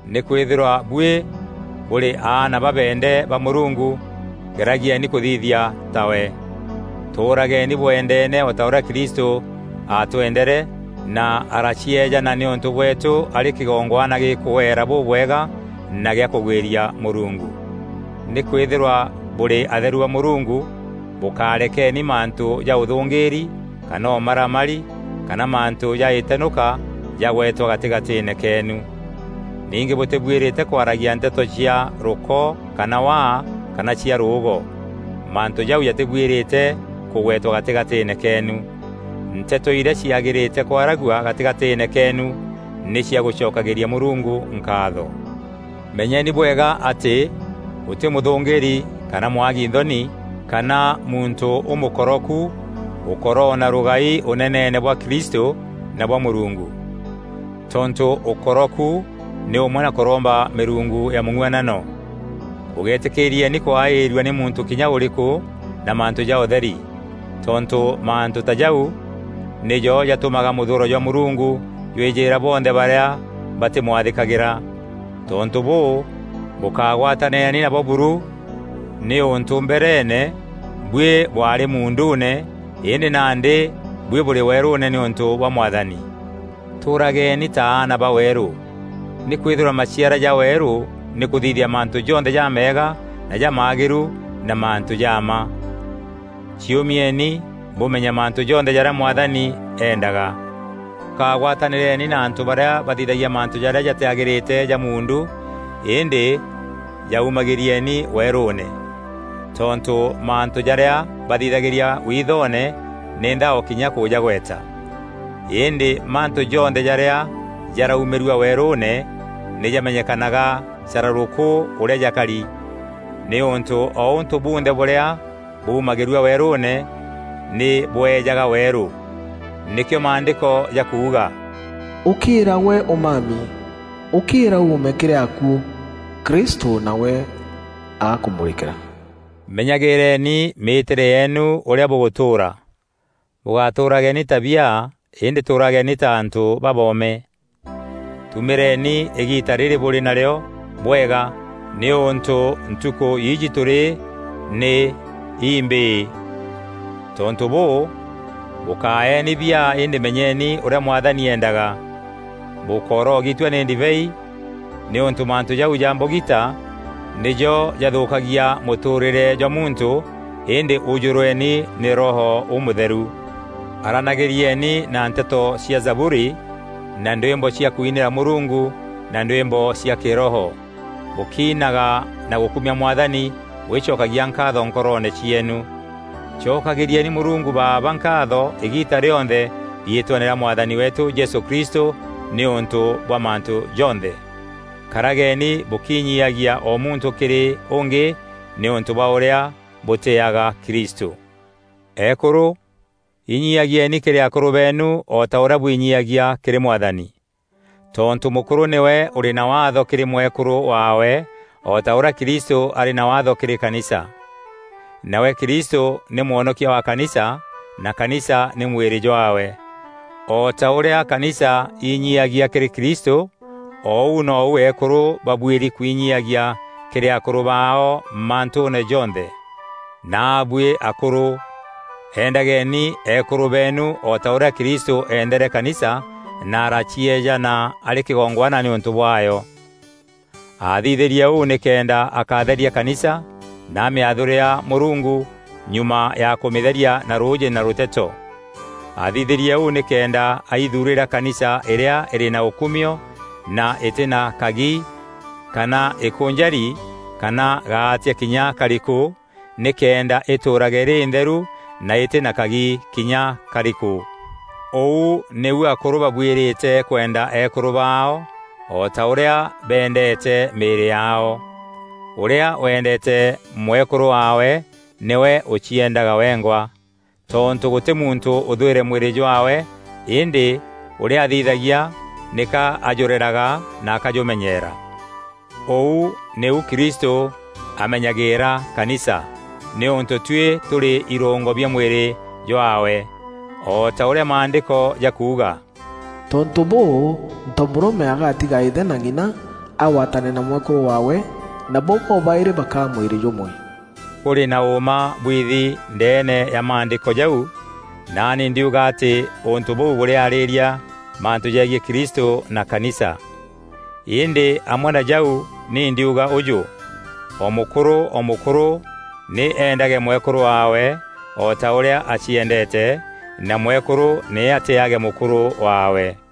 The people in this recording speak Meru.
Nîkwîthîrwa buî bûrî aana babeende ba Mûrungu, geragieni kûthithia tawe. Tûûrageni bweendene o ta ûrîa Kristû aatwendere, na aracieejana nîûntû bweetû arî kîgongwana gîkûeera bûbwega na gîa kûgwîria Mûrungu. Nîkwîthîrwa bûrî atheru ba Mûrungu, bûkarekeni mantû ja ûthûngîîri kana ûmaramari kana mantû ja îtenûka jagwetwa gatîgatîîne keenu. Ningî bûtîbuîrîte kwaragia nteto cia rûko kana waa, kana cia rûûgo; mantû jau jatîbuîrîte kûgwetwa gatîgatîîne keenu. Nteto irîa ciagîrîte kwaragua gatîgatîîne keenu nî cia gûcokagîria Mûrungu nkaatho. Menyeni bwega atî gûtî mûthûngîîri kana mwagi nthoni kana muntû ûmûkoroku ûkoroona rûgai Ûneneene bwa Kristû na bwa Mûrungu. Tontû ûkoroku nî ûmwe na kûromba mîrungu ya mûng'uanano. Bûgeetîkîîrieni kwaîrua nî muntû kinya ûrîkû na mantû ja ûtheri. Tontû mantû ta jau nîjo jatûmaga mûthûûro jwa Mûrungu jwîjîîra bonthe barîa batîmwathîkagîra. Tontû bûû, bûkagwatanîreni nabo buru, nîûntû mbereene, buî bwaarî muunduune, îndî nandî buî bûrî weerûûne nîûntû bwa Mwathani. Tûûrageni ta aana ba weerû. Nîkwîthîrwa maciara ja weerû nî kûthithia mantû jonthe jameega na jamagîru na mantû ja mma. Ciûmieni bûmenye mantû jonthe jarîa Mwathani eendaga. Bûkagwatanîreni na antû barîa bathithagia mantû jarîa jatîagîrîte ja muundu îndî jaumagîrieni weerûûne. Tontû mantû jarîa bathithagîria withoone nî nthao kinya kûjagweta. Îndî mantû jonthe jarîa jaraumîrua weerûûne, nî jamenyekanaga carûrûkû ûrîa jakari, nîûntû o ûntû bunthe bûrîa bûmagîrua weerûûne nî bweejaga weerû. Nîkîo Maandîko jakuuga: “Ûkîîra gwe ûmami, ûkîîra uume kîrî akuû, Kristû nawe agakûmûrîkîra.” Menyagîîreeni mîîtîre yeenu ûrîa bûgûtûûra. Bûgatûûrageni ta biaa îndî tûûrageeni ta antû baboome. Tumîreni îgiita rîrî bûrî narîo bwega nîûntû ntukû iji tûrî nî imbîî. Tontû bûû, bûkaaeni biaa îndî menyeni ûrîa Mwathani eendaga. Bûkórogitua nî ndibei, nîûntû mantû jau ja mbogita nîjo jathûkagia mûtûûrîre jwa muntû, îndî ûjûrweni nî Roho Ûmûtheru. Aranagîrieni na nteto cia Zaburi na ndwîmbo cia kwinîra Mûrungu na ndwîmbo cia kiroho; bûkiinaga na gûkumia Mwathani bûgîcokagia nkaatho nkoroone cieenu. Cokagîrieni Mûrungu Baaba nkaatho îgiita rîonthe riîtweene rîa Mwathani weetû Jesû Kristû nîûntû bwa mantû jonthe. Karageni bûkinyiagia o muntû kîrî ûngî nîûntû bwa ûrîa bûtîîaga Kristû. Eekûrû, inyiagieeni kîrî akûrû beenu o ta ûrîa bwinyiagia kîrî Mwathani. Tontû mûkûrû nîwe ûrî na Waatho kîrî mwekûrû waawe, o ta ûrîa Kristû arî na Waatho kîrî kanisa. Nawe Kristû nî Mwonokia wa kanisa, na kanisa nî mwîrî jwaawe. O ta ûrîa kanisa inyiagia kîrî Kristû, o ûu nou eekûrû babuîri kwinyiyagia kîrî akûrû baao mantûûne jonthe. Naabuî akûrû, endageni eekûrû beenu o ta ûrîa Kristû eendere kanisa na aracieejana arî kîgongwana nîûntû bwaayo. Aathithîrie ûu nîkenda akatheria kanisa na amîathûrîra Mûrungu nyuma ya kûmîtheria na rûûjî na rûteto. Aathithîrie ûu nîkenda aithuurîra kanisa îrîa îrî na ûkumio, na îtî na kagi kana îkûnjari kana gaatia kinya karîkû, nîkenda îtûûrage îrî întheru na îtî na kagi kinya karîkû. Ûu nîu akûrû babuîrîte kwenda eekûrû baao o ta ûrîa beendeete mîîrî yaao. Ûrîa weendeete mwekûrû waawe nîwe ûcieendaga wengwa. Tontû gûtî muntû ûthwîre mwîrî jwaawe îndî ûrîa athithagia nîka ajûreraga na akajûmenyeera. Ûu nîu Kristû amenyagîîra kanisa, nîûntû tuî tûrî irûngo bia mwîrî jwaawe. O ta ûrîa Maandîko jakuuga, “Tontû bûû, ntomûrûme agatiga îthe na ng'ina, agwatane na mwekûrû waawe, nabo bobaîrî bakaa mwîrî jûmwe.” Kûrî na ûûma bwiithi ndeene ya Maandîko jau, naani ndiuga atî ûntû bûu bûrîarîîria mantû jegiî Kristû na kanisa. Îndî amwe na jau ni ndiuga ûjû: O mûkûrû o mûkûrû nî eendage mwekûrû waawe o ta ûrîa aciendeete, na mwekûrû nî atîîage mûkûrû waawe.